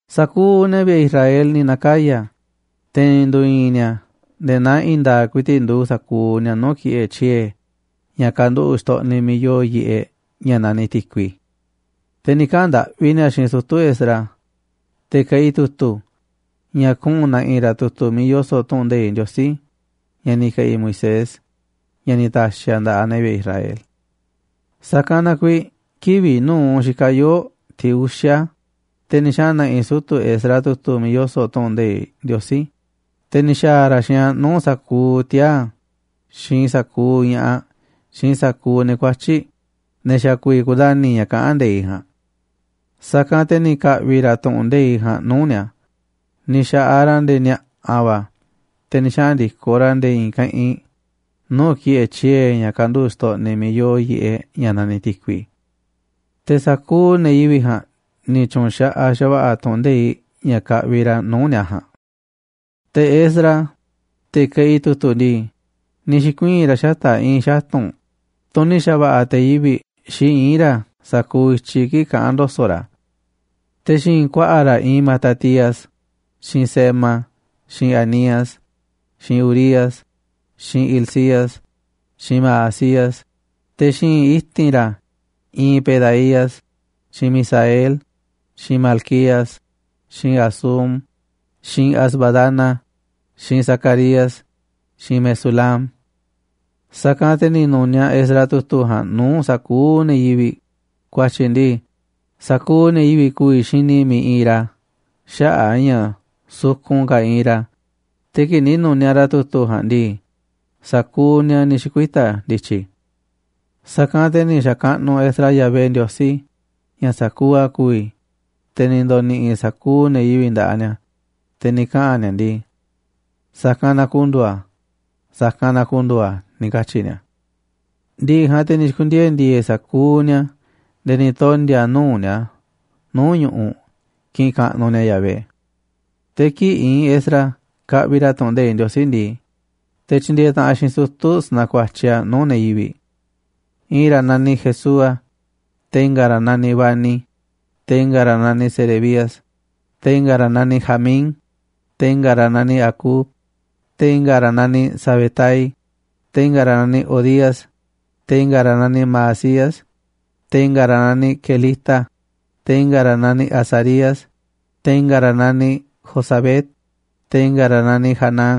Sa̱kuuꞌ ne̱ vi̱ꞌe̱ Israel ni̱ na̱kaya̱, te̱ ni̱ ndu̱i̱i̱n ni̱a̱ nde̱e̱ naa i̱i̱n nda̱a̱ꞌ ku̱i̱ti̱ꞌ nduuꞌ sa̱kuuꞌ ni̱a̱ nuu̱ꞌ ki̱ꞌe̱ tyiee̱ ña̱ kanduꞌu̱ꞌ xtoꞌniꞌ miiꞌ yoo yiꞌeꞌ ña̱ naniꞌ Ti̱kui. Te̱ ni̱ kaꞌa̱n ndaꞌvi ni̱a̱ xiinꞌ sutu̱ Esdras, te̱ keꞌi tu̱tu̱, ña̱ kuꞌu̱n na̱ꞌi̱ ra̱ tu̱tu̱ miiꞌ yoso̱ꞌ tu̱ꞌu̱n nde̱iꞌ Ndiosí ña̱ ni̱ ke̱ꞌi̱ Moisés, ña̱ ni̱ ta̱xi̱ a̱ nda̱ꞌaꞌ ne̱ vi̱ꞌe̱ Israel. Sa̱kanꞌ na kuiiꞌ kivi̱ꞌ nu̱uꞌ xikaꞌ yoo̱ꞌ tiꞌ uxa̱, te̱ ni̱ xaꞌa̱n na̱ꞌi̱ sutu̱ Esdras tu̱tu̱ miiꞌ yoso̱ꞌ tu̱ꞌu̱n nde̱iꞌ Ndiosí, te̱ ni̱ xa̱a̱ ra̱ xiinꞌ a̱ nuu̱ꞌ sa̱kuuꞌ tiaa̱ xiinꞌ sa̱kuuꞌ ña̱ꞌaꞌ xiinꞌ sa̱kuuꞌ ne̱ kuatyi̱ꞌ, ne̱ xa̱ ku̱vi̱ kundani̱ ña̱ kaꞌán nde̱iꞌ ja̱a̱nꞌ. Sa̱kanꞌ te̱ ni̱ ka̱ꞌvi̱ ra̱ tu̱ꞌu̱n nde̱iꞌ ja̱a̱nꞌ nuu̱ꞌ ni̱a̱. Ni̱ xa̱ꞌaꞌ ra̱ nde̱e̱ ni̱a̱ꞌa̱ va̱ te̱ ni̱ xaꞌa̱n ndi̱koꞌ ra̱ nde̱e̱ i̱i̱n keꞌinꞌ nuu̱ꞌ ki̱ꞌe̱ tyiee̱ ña̱ kanduꞌu̱ꞌ xtoꞌniꞌ miiꞌ yoo yiꞌeꞌ ña̱ naniꞌ Ti̱kui. Te̱ sa̱kuuꞌ ne̱ yivi̱ꞌ ja̱a̱nꞌ ni̱ tyu̱nxaꞌaꞌ xa̱va̱ꞌa̱ tu̱ꞌu̱n nde̱iꞌ ña̱ kaꞌviꞌ ra̱ nuu̱ꞌ ni̱a̱ ja̱a̱nꞌ. Te̱ Esdras, te̱ keꞌi tu̱tu̱ ndii, ni̱ xi̱kuii̱n ra̱ xata̱ꞌ i̱i̱n xatu̱nꞌ, tunꞌ ni̱ xa̱ꞌa̱ te̱ yivi̱ꞌ xi iín ra̱ sa̱kuuꞌ i̱tyiꞌ kii̱ꞌ kaꞌán ndo̱so̱ꞌ ra̱. Te̱ xi̱i̱nꞌ ku̱a̱ꞌa̱ ra̱ iinꞌ Matatías, xiinꞌ Sema, xiinꞌ Anías, xiinꞌ Urías, xiinꞌ Hilcías, xiinꞌ Maasías. Te̱ xi̱i̱nꞌ i̱ti̱n ra̱ iinꞌ Pedaías, xiinꞌ Misael, xiinꞌ Malquías, xiinꞌ Hasum, xiinꞌ Hasbadana, xiinꞌ Zacarías, xiinꞌ Mesulam. Sa̱kanꞌ te̱ ni̱ nu̱niaꞌ Esdras tu̱tu̱ ja̱a̱nꞌ nuu̱ꞌ sa̱kuuꞌ ne̱ yivi̱ꞌ, ku̱a̱tyi̱ ndii, sa̱kuuꞌ ne̱ yivi̱ꞌ ku̱vi̱ xini miiꞌ iinꞌ ra̱ xaꞌa̱ꞌ a̱ ña̱ sukun ka̱ iinꞌ ra̱, te̱ kii̱ꞌ ni̱ nu̱niaꞌ ra̱ tu̱tu̱ ja̱a̱nꞌ ndii, sa̱kuuꞌ ni̱a̱ ni̱ xi̱kuita̱ ndi̱tyi̱. Sa̱kanꞌ te̱ ni̱ xa̱kaꞌnuꞌ Esdras Yahvé Ndiosí, ña̱ sa̱kuuꞌ a̱ ku̱vi̱, te̱ ni̱ ndo̱ni̱ꞌi̱ sa̱kuuꞌ ne̱ yivi̱ꞌ nda̱ꞌaꞌ ni̱a̱, te̱ ni̱ kaꞌa̱n ni̱a̱ ndii: ―Sa̱kanꞌ na ku̱ndu̱u̱ a̱, sa̱kanꞌ na ku̱ndu̱u̱ a̱ ―ni̱ katyi̱ ni̱a̱. Ndi̱ꞌi̱ ja̱a̱nꞌ te̱ ni̱ xi̱ku̱ndiee̱ ndi̱e̱e̱ sa̱kuuꞌ ni̱a̱ nde̱e̱ ni̱ tondi̱a̱ nuu̱ꞌ ni̱a̱ nuu̱ꞌ ñu̱ꞌuꞌ kiꞌinꞌ kaꞌnuꞌ ni̱a̱ Yahvé. Te̱ kii̱ꞌ iinꞌ Esdras kaꞌviꞌ ra̱ tu̱ꞌu̱n nde̱iꞌ Ndiosí ndii, te̱ tyindieeꞌ taꞌanꞌ xiinꞌ sutu̱ sanakuatyiꞌ a̱ nuu̱ꞌ ne̱ yivi̱ꞌ. I̱i̱n ra̱ naniꞌ Jesúa, te̱ i̱nga̱ ra̱ naniꞌ Bani, te̱ i̱nga̱ ra̱ naniꞌ Serebías, te̱ i̱nga̱ ra̱ naniꞌ Jamín, te̱ i̱nga̱ ra̱ naniꞌ Acub, te̱ i̱nga̱ ra̱ naniꞌ Sabetai, te̱ i̱nga̱ ra̱ naniꞌ Hodías, te̱ i̱nga̱ ra̱ naniꞌ Maasías, te̱ i̱nga̱ ra̱ naniꞌ Kelita, te̱ i̱nga̱ ra̱ naniꞌ Azarías, te̱ i̱nga̱ ra̱ naniꞌ Jozabed, te̱ i̱nga̱ ra̱ naniꞌ Hanán,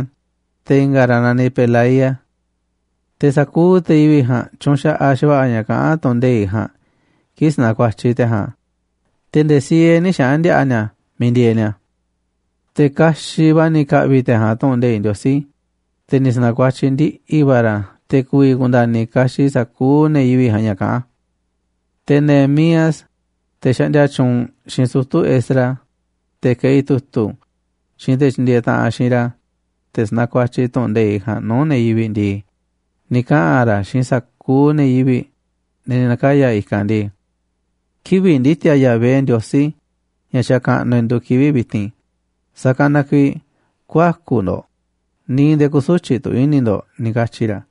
te̱ i̱nga̱ ra̱ naniꞌ Pelaía. Te̱ sa̱kuuꞌ ne̱ yivi̱ꞌ ja̱a̱nꞌ tyunxaꞌaꞌ xa̱va̱ꞌa̱ ña̱ kaꞌán tu̱ꞌu̱n nde̱iꞌ ja̱a̱nꞌ kii̱ꞌ sanakuatyiꞌ te̱ ja̱a̱nꞌ a̱, te̱ nde̱e̱ siee nï̱ xaꞌa̱n ndi̱a̱ꞌa̱ ni̱a̱ miiꞌ ndieeꞌ ni̱a̱. Te̱ kaxiꞌ va̱ ni̱ ka̱ꞌvi̱ te̱ ja̱a̱nꞌ tu̱ꞌu̱n nde̱iꞌ Ndiosí, te̱ ni̱ sa̱na̱kuatyiꞌ ndiꞌi̱ va̱ ra̱ a̱ te̱ ku̱vi̱ ku̱nda̱ni̱ kaxiꞌ sa̱kuuꞌ ne̱ yivi̱ꞌ ja̱a̱nꞌ ña̱ kaꞌán a̱. Te̱ Nehemías, te̱ xaꞌndia tyuunꞌ, xiinꞌ sutu̱ Esdras, te̱ keꞌi tu̱tu̱, xiinꞌ te̱ tyindieeꞌ taꞌanꞌ xiinꞌ ra̱, te̱ sanakuatyiꞌ tu̱ꞌu̱n nde̱iꞌ ja̱a̱nꞌ nuu̱ꞌ ne̱ yivi̱ꞌ ndii, ni̱ kaꞌa̱n ra̱ xiinꞌ sa̱kuuꞌ ne̱ yivi̱ꞌ, ne̱ ni̱ na̱kaya̱ i̱kanꞌ ndii: ―Kivi̱ꞌ ndi̱ti̱a̱ Yahvé Ndiosí, ña̱ xakaꞌnuꞌ e̱ꞌ, nduuꞌ kivi̱ꞌ vi̱ti̱n, sa̱kanꞌ na kuiiꞌ ku̱ä̱ku̱ ndo̱ꞌ, ni̱ nde̱e̱ kü̱su̱tyiꞌ tu̱ i̱ni̱ ndo̱ꞌ ―ni̱ katyi̱ ra̱.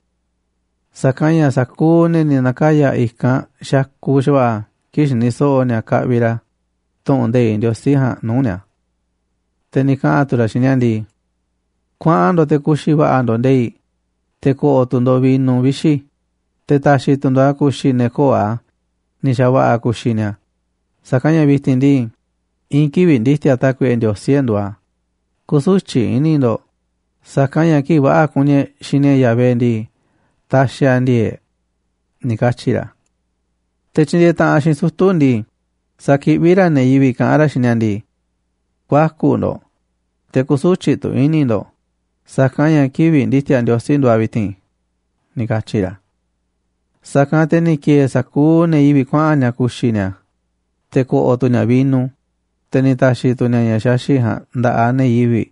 Sa̱kanꞌ ña̱ sa̱kuuꞌ ne̱ ni̱ na̱kayaꞌ i̱kanꞌ xakuꞌ xa̱va̱ꞌa̱ kii̱ꞌ xiniꞌ so̱ꞌo̱ ni̱a̱ kaꞌviꞌ ra̱ tu̱ꞌu̱n nde̱iꞌ Ndiosí ja̱a̱nꞌ nuu̱ꞌ ni̱a̱. Te̱ ni̱ kaꞌa̱n tu̱ ra̱ xiinꞌ ni̱a̱ ndii: ―Kuaꞌan ndo̱ꞌ te̱ ku̱xi̱ va̱ꞌa̱ ndo̱ꞌ nde̱i̱ꞌ, te̱ ko̱ꞌo̱ tu̱ ndo̱ꞌ vino vixi̱, te̱ ta̱xi̱ tu̱ ndo̱ꞌ a̱ ku̱xi̱ ne̱ köo̱ꞌ a̱ ni̱ xa̱va̱ꞌa̱ ku̱xi̱ ni̱a̱, sa̱kanꞌ ña̱ vi̱ti̱n ndii, i̱i̱n kivi̱ꞌ ndi̱ti̱a̱ Tákuiꞌe Ndiosí e̱ꞌ nduuꞌ a̱. Kü̱su̱tyiꞌ i̱ni̱ ndo̱ꞌ, sa̱kanꞌ ña̱ kii̱ꞌ va̱ꞌa̱ kuni e̱ꞌ xini e̱ꞌ Yahvé ndii, taxiꞌ a̱ ndi̱e̱e̱ꞌ e̱ꞌ ―ni̱ katyi̱ ra̱. Te̱ tyindieeꞌ taꞌanꞌ xiinꞌ sutu̱ ndii, sakiꞌví ra̱ ne̱ yivi̱ꞌ kaꞌán ra̱ xiinꞌ ni̱a̱ ndii: ―Ku̱ä̱ku̱ ndo̱ꞌ, te̱ kü̱su̱tyiꞌ tu̱ i̱ni̱ ndo̱ꞌ, sa̱kanꞌ ña̱ kivi̱ꞌ ndi̱ti̱a̱ Ndiosí nduuꞌ a̱ vi̱ti̱n ―ni̱ katyi̱ ra̱. Sa̱kanꞌ te̱ ni̱ ki̱e̱e̱ sa̱kuuꞌ ne̱ yivi̱ꞌ kuaꞌa̱n ni̱a̱ ku̱xi̱ ni̱a̱ te̱ ko̱ꞌo̱ tu̱ ni̱a̱ vino, te̱ ni̱ ta̱xi̱ tu̱ ni̱a̱ ña̱ xaxi̱ꞌ ja̱a̱nꞌ nda̱ꞌaꞌ ne̱ yivi̱ꞌ,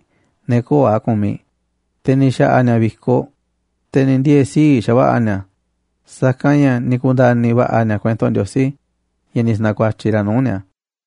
ne̱ köo̱ꞌ a̱ kumiꞌ, te̱ ni̱ xa̱ꞌa̱ ni̱a̱ vi̱koꞌ, te̱ ni̱ ndiee̱ sii̱ꞌ xa̱va̱ꞌa̱ ni̱a̱, sa̱kanꞌ ña̱ ni̱ ku̱nda̱ni̱ va̱ꞌa̱ ni̱a̱ kuento Ndiosí ña̱ ni̱ sa̱na̱kuatyiꞌ ra̱ nuu̱ꞌ ni̱a̱.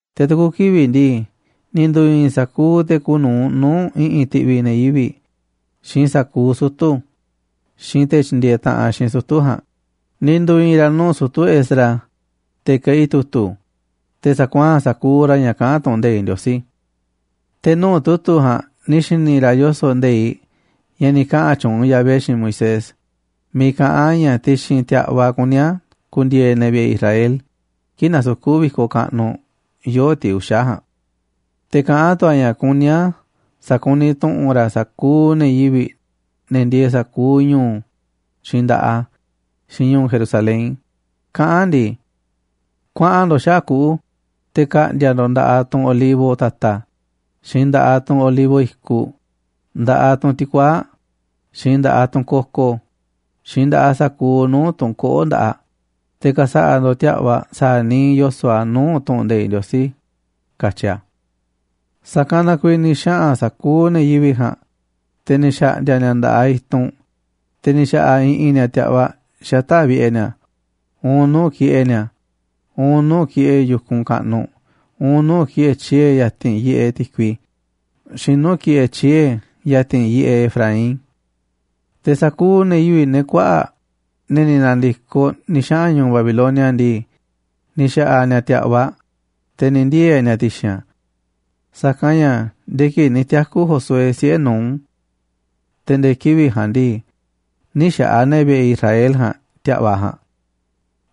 Te̱ tu̱ku̱ kivi̱ꞌ ndii, ni̱ ndu̱i̱i̱n sa̱kuuꞌ te̱ kuuꞌ nu̱uꞌ nuu̱ꞌ i̱ꞌi̱n ti̱ꞌvi̱ ne̱ yivi̱ꞌ, xiinꞌ sa̱kuuꞌ sutu̱, xiinꞌ te̱ tyindieeꞌ taꞌanꞌ xiinꞌ sutu̱ ja̱a̱nꞌ, ni̱ ndu̱i̱i̱n ra̱ nuu̱ꞌ sutu̱ Esdras, te̱ keꞌi tu̱tu̱, te̱ sa̱kuaa̱n ra̱ sa̱kuuꞌ ña̱ kaꞌán tu̱ꞌu̱n nde̱iꞌ Ndiosí. Te̱ nuu̱ꞌ tu̱tu̱ ja̱a̱nꞌ ni̱ xi̱ni̱ ra̱ yoso̱ꞌ nde̱iꞌ ña̱ ni̱ kaꞌa̱n tyuunꞌ Yahvé xiinꞌ Moisés, miiꞌ kaꞌán a̱ ña̱ ti̱xi̱n ti̱a̱ꞌvaꞌ kuní a̱ ku̱ndi̱e̱e̱ ne̱ vi̱ꞌe̱ Israel kii̱ꞌ nasukú vi̱koꞌ kaꞌnuꞌ yoo̱ꞌ tiꞌ uxa̱ ja̱a̱nꞌ. Te̱ kaꞌán tu̱ a̱ ña̱ kuní a̱ sa̱kuniꞌ tu̱ꞌu̱n ra̱ sa̱kuuꞌ ne̱ yivi̱ꞌ, ne̱ ndieeꞌ sa̱kuuꞌ ñu̱u̱, xiinꞌ nda̱ꞌaꞌ a̱, xiinꞌ ñu̱u̱ Jerusalén, kaꞌán ndii: “Kuaꞌa̱n ndo̱ꞌ xaꞌa̱ꞌ kuꞌu̱ te̱ ka̱ꞌndi̱a̱ ndo̱ꞌ nda̱ꞌaꞌ tunꞌ olivo ta̱ta̱, xiinꞌ nda̱ꞌaꞌ tunꞌ olivo i̱kuꞌ, nda̱ꞌaꞌ tunꞌ ti̱kuaa̱ꞌ, xiinꞌ nda̱ꞌaꞌ tunꞌ koko, xiinꞌ nda̱ꞌaꞌ sa̱kuuꞌ nuu̱ꞌ tunꞌ koꞌó nda̱ꞌaꞌ, te̱ ka̱sa̱ꞌa̱ ndo̱ꞌ ti̱a̱ꞌvaꞌ sa̱a̱ niiꞌ yoso̱ꞌ a̱ nuu̱ꞌ tu̱ꞌu̱n nde̱iꞌ Ndiosí,” katyi a̱. Sa̱kanꞌ na kuiiꞌ ni̱ xaꞌa̱n sa̱kuuꞌ ne̱ yivi̱ꞌ ja̱a̱nꞌ, te̱ ni̱ xa̱ꞌndi̱a̱ ni̱a̱ nda̱ꞌaꞌ i̱tunꞌ, te̱ ni̱ xa̱ꞌa̱ i̱ꞌi̱n ni̱a̱ ti̱a̱ꞌvaꞌ xata̱ꞌ vi̱ꞌe̱ ni̱a̱, uun nuu̱ꞌ ki̱ꞌe̱ ni̱a̱, uun nuu̱ꞌ ki̱ꞌe̱ yu̱kunꞌ kaꞌnuꞌ, uun nuu̱ꞌ ki̱ꞌe̱ tyiee̱ ya̱ti̱n yiꞌeꞌ Ti̱kui, xiinꞌ nuu̱ꞌ ki̱ꞌe̱ tyiee̱ ya̱ti̱n yiꞌeꞌ Efraín. Te̱ sa̱kuuꞌ ne̱ yivi̱ꞌ, ne̱ kuaꞌa̱ꞌ, ne̱ ni̱ na̱ndi̱koꞌ ni̱ xaꞌa̱n ñu̱u̱ Babilonia ndii, ni̱ xa̱ꞌa̱ ni̱a̱ ti̱a̱ꞌvaꞌ, te̱ ni̱ ndiee̱ ni̱a̱ ti̱xi̱n a̱. Sa̱kanꞌ ña̱ nde̱e̱ kii̱ꞌ ni̱ tiaku̱ Josué, siꞌe̱ Nun, te̱ nde̱e̱ kivi̱ꞌ ja̱a̱nꞌ ndii, nï̱ xa̱ꞌa̱ ne̱ vi̱ꞌe̱ Israel ja̱a̱nꞌ ti̱a̱ꞌvaꞌ ja̱a̱nꞌ.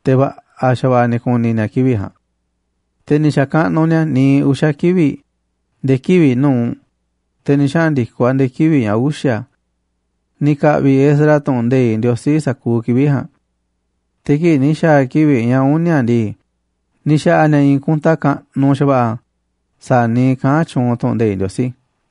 Te̱ va̱ꞌa̱ xa̱va̱ꞌa̱ ni̱ ku̱ni̱ ni̱a̱ kivi̱ꞌ ja̱a̱nꞌ. Te̱ ni̱ xa̱kaꞌnuꞌ ni̱a̱ niiꞌ uxa̱ kivi̱ꞌ nde̱e̱ kivi̱ꞌ nu̱uꞌ, te̱ ni̱ xaꞌa̱n ndi̱koꞌ a̱ nde̱e̱ kivi̱ꞌ ña̱ uxa̱. Ni̱ ka̱ꞌvi̱ Esdras tu̱ꞌu̱n nde̱iꞌ Ndiosí sa̱kuuꞌ kivi̱ꞌ ja̱a̱nꞌ, te̱ kii̱ꞌ ni̱ xa̱a̱ kivi̱ꞌ ña̱ uni̱a̱ ndii, ni̱ xa̱ꞌa̱ ni̱a̱ i̱i̱n kunta kaꞌnuꞌ xa̱va̱ꞌa̱ sa̱a̱ niiꞌ kaꞌán tyuunꞌ tu̱ꞌu̱n nde̱iꞌ Ndiosí.